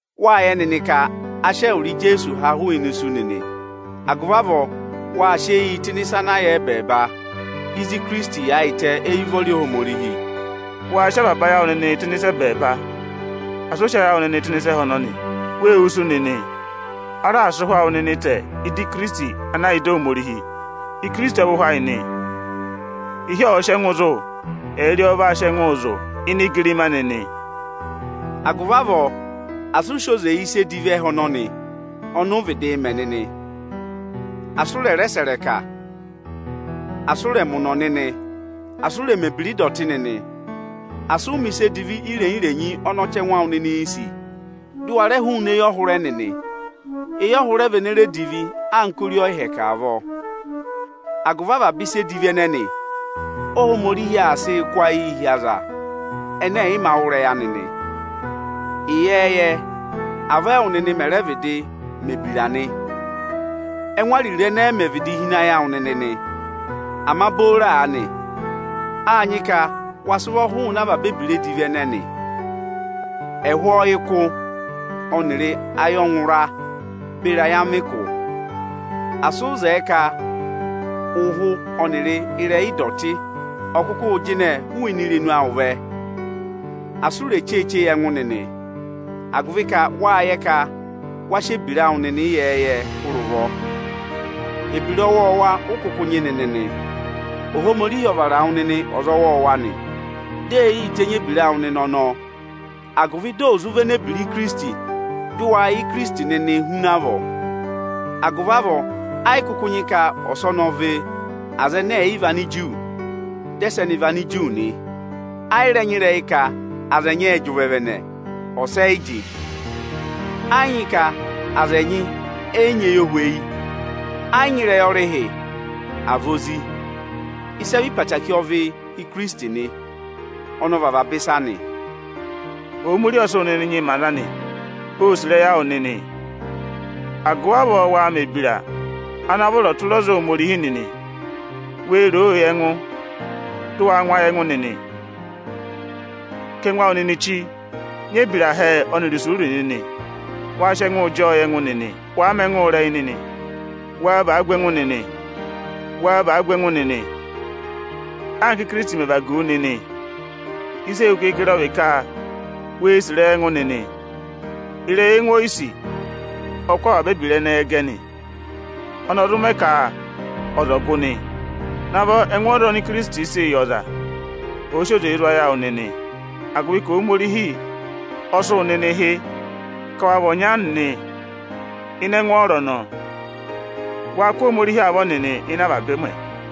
Wáa yẹ nịnị ka a sị ẹwụrị Ijeesu ha hụụnị isu nịnị. Agụvị avọọ waa sị eyii tụ́ ịnị ịsa ana yà ẹbẹẹba, ịzị Ikirisiti yaayịtẹ éyi ụvọrị Ohomorihi. Waa sị avaba ayị awụ nịnịị tụ́ ịnị ịsa ẹbẹẹba; asị ụ sị ayị awụ nịnị tụ́ ịnị ịsa ẹhẹ ọnọnị. Wê wusu nịnị. A raà sị ụhwẹ awụ nịnị tẹ ị́dị Ikirisiti ana yà ịdị Ohomorihi. Ikirisiti ọ vị ẹhẹ ayị nị; ịhị ọ̀ọ sị ẹngụ zụ̀, ẹyịrị ọ ọ vaa sị ẹngụụ zụ̀ ini igirima anị nị. Agụvị avọọ asị ụ sị oze yị ịsa edivi ẹhẹ ọnọnị ọnị ụụ̄ vịdịị mẹ nịnị. Asị ụ rẹ̀ rẹ sẹ̀ ịrẹka, asị ụ rẹ̀ mẹ ụ̀nọ̀ nịnị; asị ụ rẹ̀ mẹ̀ ebira ịdọtị nịnị, asị ụ mẹ̀ ịsa edivi irenyi-irenyi ọnị ọchẹngụ awụ nịnịị̄ sì, dị ụ wa rẹ hụụnị eyọhụrẹ nịnị. Eyọhụrẹ vị ene re divi anka ori ọyịhẹkẹ avọọ. Agụvị avaba ịsa edivi ẹnẹnị Óhomorihi aa sịị kụ́ ayịị hi aza ẹnẹ ẹ̀yị mā wụ́ ịrẹyị anị nị. Ịyẹẹyẹ, avọọ ẹwụ nịnị mẹẹ̄ vịdịị mẹ̀ ebira nị, ẹ́ngụ ariro ẹnẹẹ mẹ vịdị hi ịnị ayị awụ nịnị nị. Ama booro aanị, áa nyị ka wa sị ụvọ hụụnị avaba ebira edivi ẹnẹnị, ẹhụụ ọyịkụ ọnịrị ayọngụra beri ayamịkụ. Asị ụ zẹẹ ka ụhụ ọnịrị ịrẹyị ịdọtị ọ̀ kụkụ jịnẹ hụụnị irenu awụ vẹ! Asị ụ rè cheeche yị ẹngụ nịnị, agụvị ka wáa yẹ ka wa sị ebira awụ nịnị ịyẹẹyẹ hụrẹ ụvọ, ebira ọwọọwa ụ kụkụ nyị nịnị nị. Ohomorihi ọ vara wụ nịnị ọza ọwọọwa nị. Dị ee yii tenyi ebira awụ nịnị ọnọọ, agụvị dị ò zụ véné ebira Ikirisiti, dị waa yẹ Ikirisiti nịnịị huna avọọ nị. Agụvị avọọ ẹ yị kụkụ nyị ka ọsọnị ọ vị Anigiriki, dị ẹsẹnị vị Aniju nị. Ẹ yị rẹ nyị ịrẹyị ka aza ẹnyị ẹ́ẹ jị ụvẹvẹnẹ, ọsa ẹ yị jị. Ẹ yị nyị ka aza ẹnyị ẹ yị nyị eyohweyi; ẹ yị nyị ịrẹyị ọrịhị, àa vị ozi. Ịsị ẹ vị ịrẹyị obooro ọ vị Ikirisiti nị. Ọnị ọ vị avaba ịsa nị. Ohomorihi ọ sị wụ nịnị nyị mẹ aza anị; óo sì ịrẹyị awụ nịnị. Agụvị avọọ waa mẹ̀ ebira ana vọrọ tụra ọza Ohomorihi nịnị! Wee roo yị ẹngụ, dị waa ngụ ayị ẹngụ nịnị. Kà ẹngụ awụ nịnị chí, nyị ebira hẹẹ ọnịrị ayọnẹtẹ nịnị. Waa sị ẹngụụ jị ọọ yị ẹngụ nịnị. Wàa mẹ ẹngụ ịrẹyị, waa vaa gu ẹngụ nịnị. Waa vaa gu ẹngụ nịnị anka Íkirisiti mẹ̀ vagu wu nịnị. Ịsị e hu keekere ọ vị ka wee sì ịrẹyị ẹngụ nịnị. Ịrẹyị ẹngụ oyisì ọ kụ́ avaba ebira ẹnẹẹ gẹ nị. Ọnị ọ zụ mẹ ka ọza ọ̀ gụ nị. Navọ ẹngwọọrọ oni Ikirisiti sịị̄ yị ọza ọ̀ọ sị oze zụ̀ ayị awụ nịnị, agụvị ka Ohomorihi ọ sị wụ nịnị hị́ ka wa vị ọnya nịnị ịnị ẹngwọọrọ ọnọọ. Waa kụ́ Ohomorihi avọ nịnị ịnị avaba ụmẹ.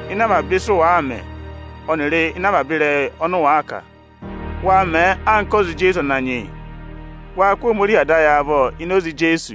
Ịnị avaba ịsị ụ wàa mẹ ọnịrị ịnị avaba ịrẹyị ọnị ụ wàa kà, waa mẹẹ anka ọza Ijeesu Ananyị yị. Waa kụ́ Ohomorihi Ada ayị avọ ini oze Ijeesu.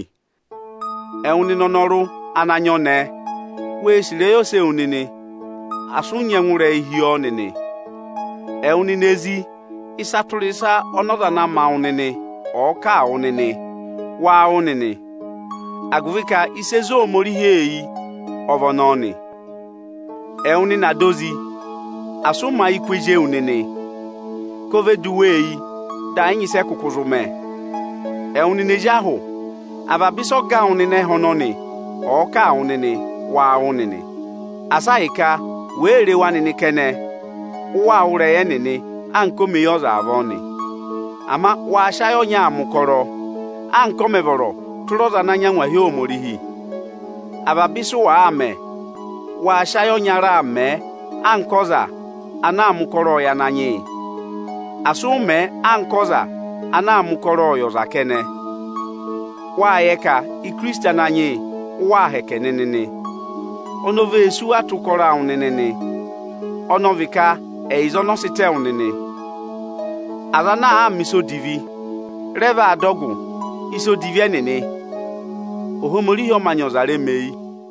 Ipi 3.7Ẹwụ nịnị anọrụ ana nyị ọnẹẹ, wee sì ịrẹyị ose ewu nịnị, asị ụ nyị ẹngụrẹyị hi wa nịnị. Ẹwụ nịnị ezi, ịsa tụra ịsa ọnị ọza ana ma wụ nịnị ọ̀ọ kà a wụ nịnị, waa wụ́ nịnị; agụvị ka ịsị e zé Ohomorihi eyi ọ vị ọnọọ nị. Ẹwụ nịnị ada ozi, asị ụ mẹ̀ ayị kụ́ ezi ewu nịnị, ka o ve du wa eyi dị ẹ yị nyị ịsị ẹ kụkụ zụ mẹ. Ẹwụ nịnị ezi ahụ, avaba ịsị ọga awụ nịnị ẹ́hẹ ọnọnị ọ̀ọ kà a wụ nịnị, waa wụ́ nịnị Asị a hị́ ka wèe re wa nịnị kẹnẹ, ụ waa wụ́ ịrẹyị ẹnịnị anka omeyọza avọọ nị. Ama waa sị ayị ọnyaa mẹ̀ ụkọrọ anka ọ mẹ̀ vọrọ tụra ọza ana nyị angwahi Ohomorihi. Avaba ịsị ụ wàa mẹ, waa sị ayị ọnyara mẹẹ anka ọza ana aa mẹ ụkọrọọ yị Ananyị yị! Asị ụ mẹ̀ ẹ anka ọza ana aa mẹ ụkọrọọ yị ọza kẹnẹ. Wáa yẹ ka Ikirisiti Ananyị yị, ụ waa hẹkẹ nịnị nị. Oni o vee sí wu atọ ụkọrọ awụ nịnị nị, ọnị ọ vị ka ẹyịza ọnị ọ sị tẹ wụ nịnị. Aza ana àa mẹ̀ ịsa odivi, rẹ vaa dọ ọgụ ịsa odivi ẹnịnị. Ohomorihi ọ mā nyị ọza remeyi.